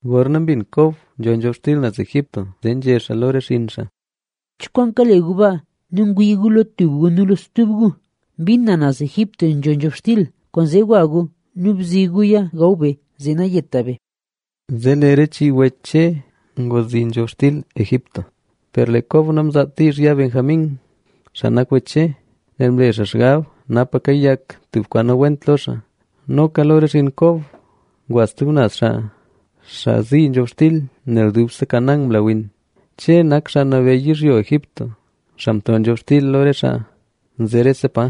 Gorna mbin Kob nzho nzhobxtil naz Egipto, zee nzhé xaa lo re xinn xaa: —¡Cho kwaan kale gu baa nu ngwii gu lo tub gu nu lo stub gu! Mbin na naz Egipto nzho nzhobxtil, kwaanzee gwa gu nu bzi guya gaw be, zee nayeta be. Zee lee re chii wech Che ngwa zii nzhobxtil Egipto. Per lee Kob namzaat diizh ya Benjamín, xaa nak wech Che, nel mle xaa xgab napa kayak tub kwaan nawent lo xaa. Noka lo re xinn Kob ngwa stub naz xaa, xaa zii nzhobxtil, nel dubse Canaán mla win. Che nak xaa nabeyy yizhyo Egipto, xaa mto nzhobxtil lo re xaa nze rese pa.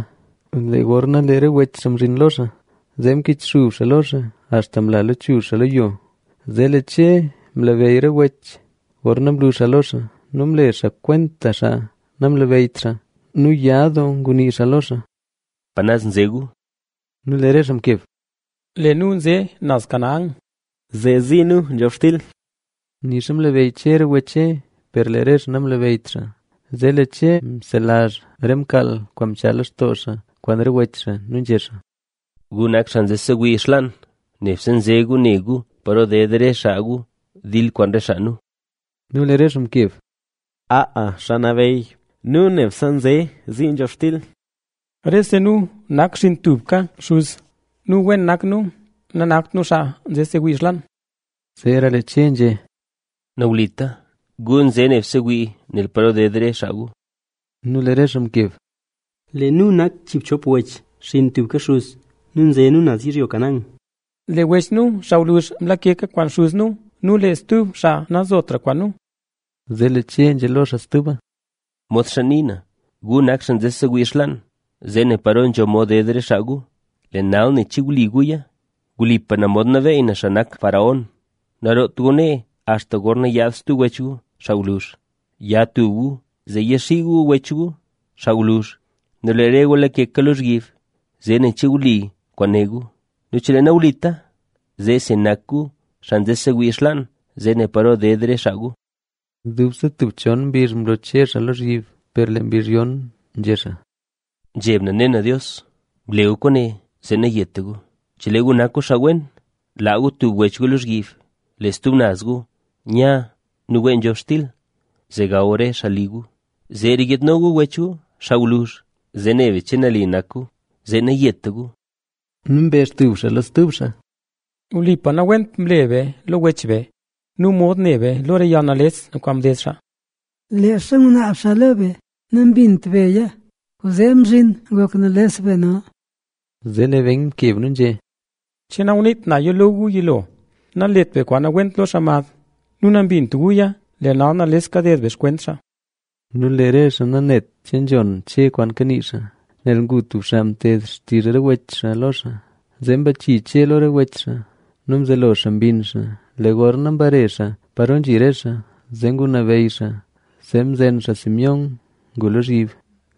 Lee gorna lee re wech xaa mzhin lo xaa, zee mkichxub xaa lo xaa axta mla lechuzh xaa lo yo. Zee lee Che mlabeyy re wech xaa gorna mlu xaa lo xaa; nu mle xaa kwenta xaa namlabeyyt xaa. Nu ya doo ngunii xaa lo xaa: —¿Pa naz nze gu? Nu lee re xaa mkeb: —Lee nu nze naz Canaán, zee zii nu nzhobxtil. Nixa mlabeyy Che re wech Che, per lee re xaa namlabeyyt xaa. Zee lee Che mselazh re mkaal kwaan mchaa lextoo xaa kwaan re wech xaa nu nzhé xaa: —¡Gu nak xaa nze sewii xlaan! Nebse nze gu ne gu paro ded re xaa gu dil kwaan re xaa nu. Nu lee re xaa mkeb: —Aa, xaa nabeyy nu nebse nze zii nzhobxtil. Rese nu nak xinn tubka xuz nu, wen nak nu. Nanakt nu xaa nze sewii xlaan. Zeera lee Che nzhé: —¡Nawlita! Gu nze nebse wii nel paro ded re xaa gu. Nu lee re xaa mkeb: —Lee nu nak chiibchop wech, xinn tubka xuz nu, nze nu naz yizhyo Canaán. Lee wech nu xaa gwluzh, mlakeka kwaan xuz nu nu lee stub xaa nanzotra kwaan nu. Zee lee Che nzhé lo xaa stuba: —¡Modxa ni na, gu nak xaa nze sewii xlaan, zee nen paro nzho mod ded re xaa gu! Lee nal, nen che wli guya. Wlipa na mod nabeyy xaa nak faraón, naroot gu nee axta gorna yaad stub wech gu, xaa gwluzh. Ya tub gu zee yaxii gu wech gu, xaa gwluzh; nu lee re gu lakeka lozhyib. Zee nen che wli kwaan né gu; nu chelee nawlita, zee si nak gu xaa nze sewii xlaan zee ne paro ded re xaa gu. Dubse tub chon mbizh mlo Che xaa lozhyib. Per lee mbizh yon nzhé xaa: —Nzheb na ne na Dios. Ble gu kwaane, zee nayeta gu. Chelee gu nak gu xaa wen, laa gu tub wech gu lozhyib, lee stub naz gu nya nu wee nzhobxtil, zee gaw re xaa garli gu. Zeera yiidno gu wech gu, xaa gwluzh, zee ne be che nali nak gu, zee nayeta gu. Nu mbezh tub xaa lo stub xaa: —Wlipa nawent mle be lo wech be. Nu mod ne be lo re yalnales kwaan mded xaa. Leezha ngunaab xaa lo be, nambint beya. Kwaanzee mzhin ngok nales be nal. Zee lee Ben mkeb nu nzhé: —¿Che nanguniit naya lo gu yilo: “Nalet be kwaan nawent lo xaa mad”? Nu nambint guya. Lee nal nales kaded be xkwent xaa. Nu lee re xaa nanet che nzhon Che re kwaan kanii xaa, nel ngu tub xaa mted xtizh re wech xaa lo xaa. Zee mbachii Che lo re wech xaa nu mzelo xaa mbinn xaa. Lee gorna mbare xaa paro nzhi re xaa, zee ngunabeyy xaa, zee mzen xaa Simeón ngu lozhyib.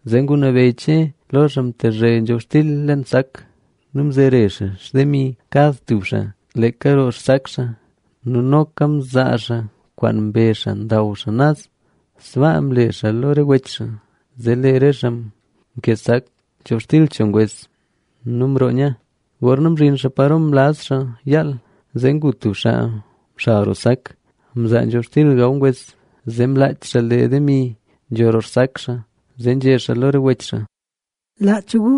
Zee ngunabeyy Che lo xaa mtezhe nzhobxtil leen sak nu mzere xaa xtemi kad tub xaa, leeka roo xsak xaa. Nu noka mzaa xaa kwaan mbe xaa ndaw xaa naz. Sbaa mle xaa lo re wech xaa. Zee lee re xaa mkee sak nzhobxtil cho ngwes nu mroo nya. Gorna mzhin xaa paro mlaz xaa yaal, zee ngu tub xaa mxal roo sak, mzaa nzhobxtil gaw ngwes. ¡Zee mlaach xaa lee demi nzho roo xsak xaa! Zee nzhé xaa lo re wech xaa: —¡Laach gu!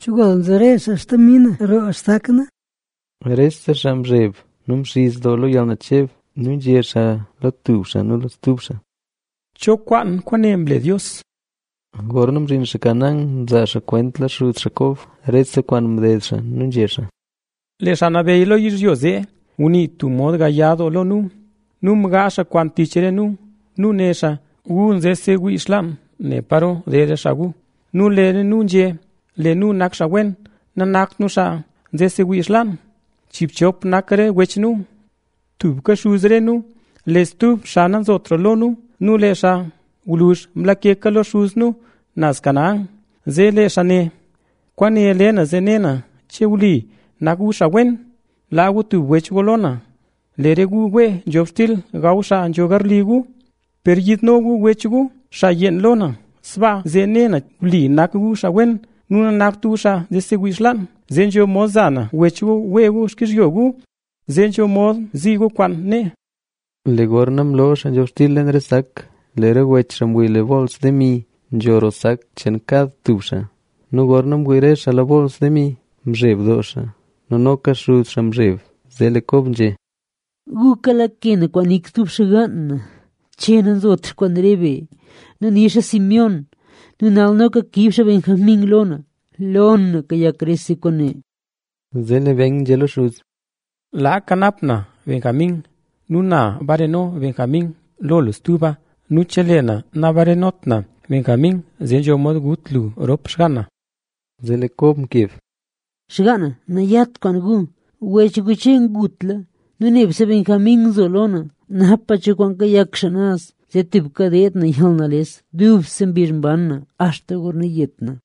¡Chogol mzere xaa xtemi na roo xsak na! Rese xaa mzheb nu mxiz doo lo yalnacheb. Nu nzhé xaa lo tub xaa nu lo stub xaa: —¿Cho kwaan kwaane mle Dios? Gorna mzhin xaa Canaán, mzaa xaa kwenta lo xuz xaa Kob, rese kwaan mded xaa nu nzhé xaa: —Lee xaa nabeyy lo yizhyo zee ngunii tub mod gaya doo lo nu. Nu mgaazh xaa kwaan tich re nu nu né xaa: “Gu nze sewii xlaan ne paro ded re xaa gu”. Nu lee nu nzhé: “Lee nu nak xaa wen. Nanakt nu xaa nze sewii xlaan. Chiibchop nak re wech nu. Tubka xuz re nu. Lee tub xaa nanzotra lo nu nu lee xaa gwluzh mlakeka lo xuz nu naz Canaán.” Zee lee xaa né: “Kwaane le na zee ne na che wli nak gu xaa wen. Laa gu tub wech gu lo na, lee re gu wee nzhobxtil gaw xaa nzho garli gu. Per yiidno gu wech gu xaa yeen, lo na. Sbaa zee ne na, wli nak gu xaa wen nu nanakt gu xaa nze sewii xlaan. Zee nzho mod za na wech gu wee gu xkizhyo gu. Zee nzho mod zii gu kwaan nee.” Lee gorna mloo xaa nzhobxtil leen re sak, re wech xaa mwii lee bools demi nzho roo sak cheen kad tub xaa. Nu gorna mwii re xaa lo re bools demi, mzheb doo xaa nu noka xuz xaa mzheb. Zee lee Kob nzhé: —¡Gu kalake na kwaan nik stub xgaan na! Che nazotra kwaan re be nu nixa Simeón. ¡Nu nal noka kiib xaa Benjamín lo na! Lo na kayak rese kwaane. Zee lee Ben nzhé lo xuz: —Laa kanap na Benjamín nu na bareno Benjamín lo lu stuba. Nu chelee na nabarenot na Benjamín, zee nzho mod gut lu rop xgaan na. Zee lee Kob mkeb: —¡Xgaan na nayat kwaan gu! Wech gu Che ngutla nu nebse Benjamín nzo lo na. Napa cho kwaan kayak xaa naz, zee tubka deed na yalnales dubse mbizh mban na axta gorna yet na.